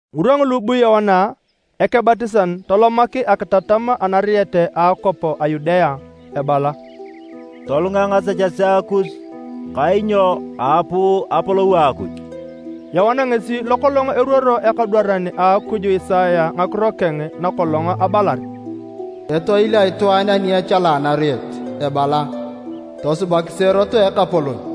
Ngirwa ngulu bu Yoana Ekebatisan tolomak akitatam anariet a akwap a Yudea ebala, “Tolunga ngasechesea kus kainyo aapuu apolou a Akuj.” Yoana ngesi lokolong eruoro ekadwaran a Akuj Isaya ngakiro keng nakolong abalar: “Etoil a itwaan ani echala anariet ebala: ‘Tosubakisi erot a Ekapolon.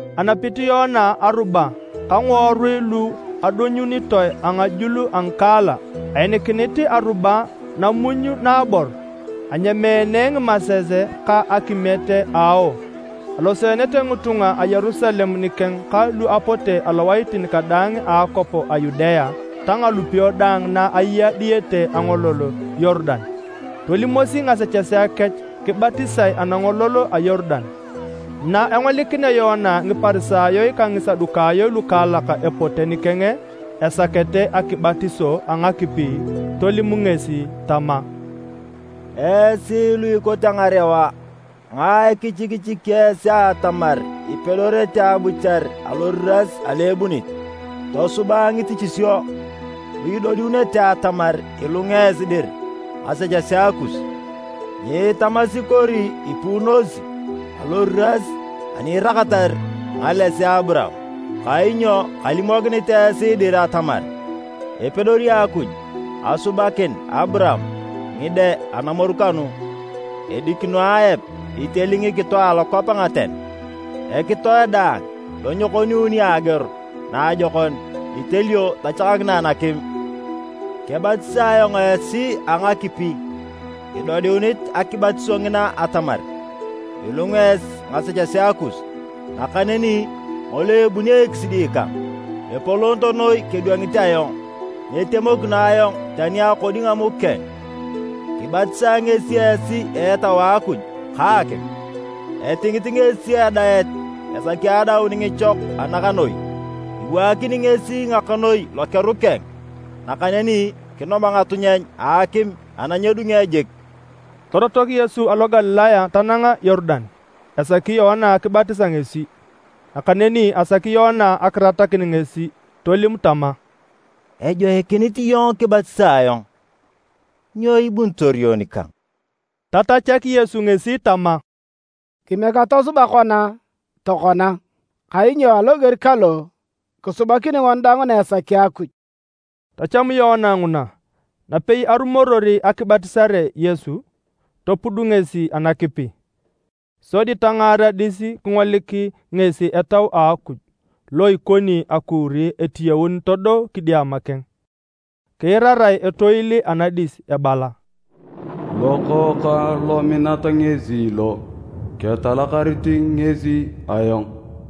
Anapit Yoana aruba ka ngiworui lu adonyunitoe angajul a ngikaala. Ainikinit aruba namuny naabor. Anyameene ngimases ka akimiet a ao. Aloseenete ngitunga a Yerusalem nikeng ka lu apote alowaitin kadaang a akwap a Yudea ta ngalupio daang na aya diyete angolol a Yorudan. Tolimosi ngasechesea kech kibatisae anangolol a Yorudan. Na engolikinea Yoana Ngiparisayo ka Ngisadukayo lukaalak epote nikeng esakete akibatiso a ngakipi, tolim ngesi tama, “Esi lu ikote ngarewa, ngae kichikichiki esi atamar ipedorete abuchar aloriras alo ebunit? Tosuba ngitichisio lu itodiunete atamar ilunga esi dir ngasechesea kus. Nyiitamasi kori ipuunosi aloriras ani iraakatar ngalesea a Aburaam, kainyo kalimokinit esi dir atamar epedori Akuj asubakin Aburaam ngide anamoru kanu. Edikino aep iteli ngikito alokwap anaten, ekitoe daang lo nyekoniuni ageor naajokon itelio tachakakinae nakim. Kebatisae ayong esi a ngakipi idodiunit akibatiso ngina atamar ilunga esi ngasechesea kus. Nakaneni ngolo ebuni ekisidi kang, epolot noi kedwangit ayong. Nyitemokino ayong tani akodi ngamuk keng. Kibatisae ngesi esi a Etau a Akuj ka akim. Etingit ngesi adaet esaki adaun ngichok a ngakanoi. Iwaakini ngesi ngakanoi lokeru keng nakaneni kinom ngatunyeny a akim ana nyedunge jik.” Torotok Yesu alo Galilaya tanang Yorudan esaki Yoana kibatisa ngesi. Nakaneni asaki Yoana akiratakin ngesi tolim tama, “Ejoikinit iyong kibatisae ayong. Nyo ibunitor iyong nikang?” Tatachak Yesu ngesi tama, “Kimiek atosuba kona tokona, kainyo aloger kalo kisubakini ngoni daang na esaki Akuj.” Tacham Yoana nguna. Napei arumoror akibatisare Yesu, topud ngesi anakipi. Sodi tangaar adis kingolik ngesi Etau a Akuj lo ikoni akuuri etiyaun todo kidiama keng. Kiirarae etoil anadis ebala, “Lokookang lominat ngesi lo, ketalakarit ngesi ayong.”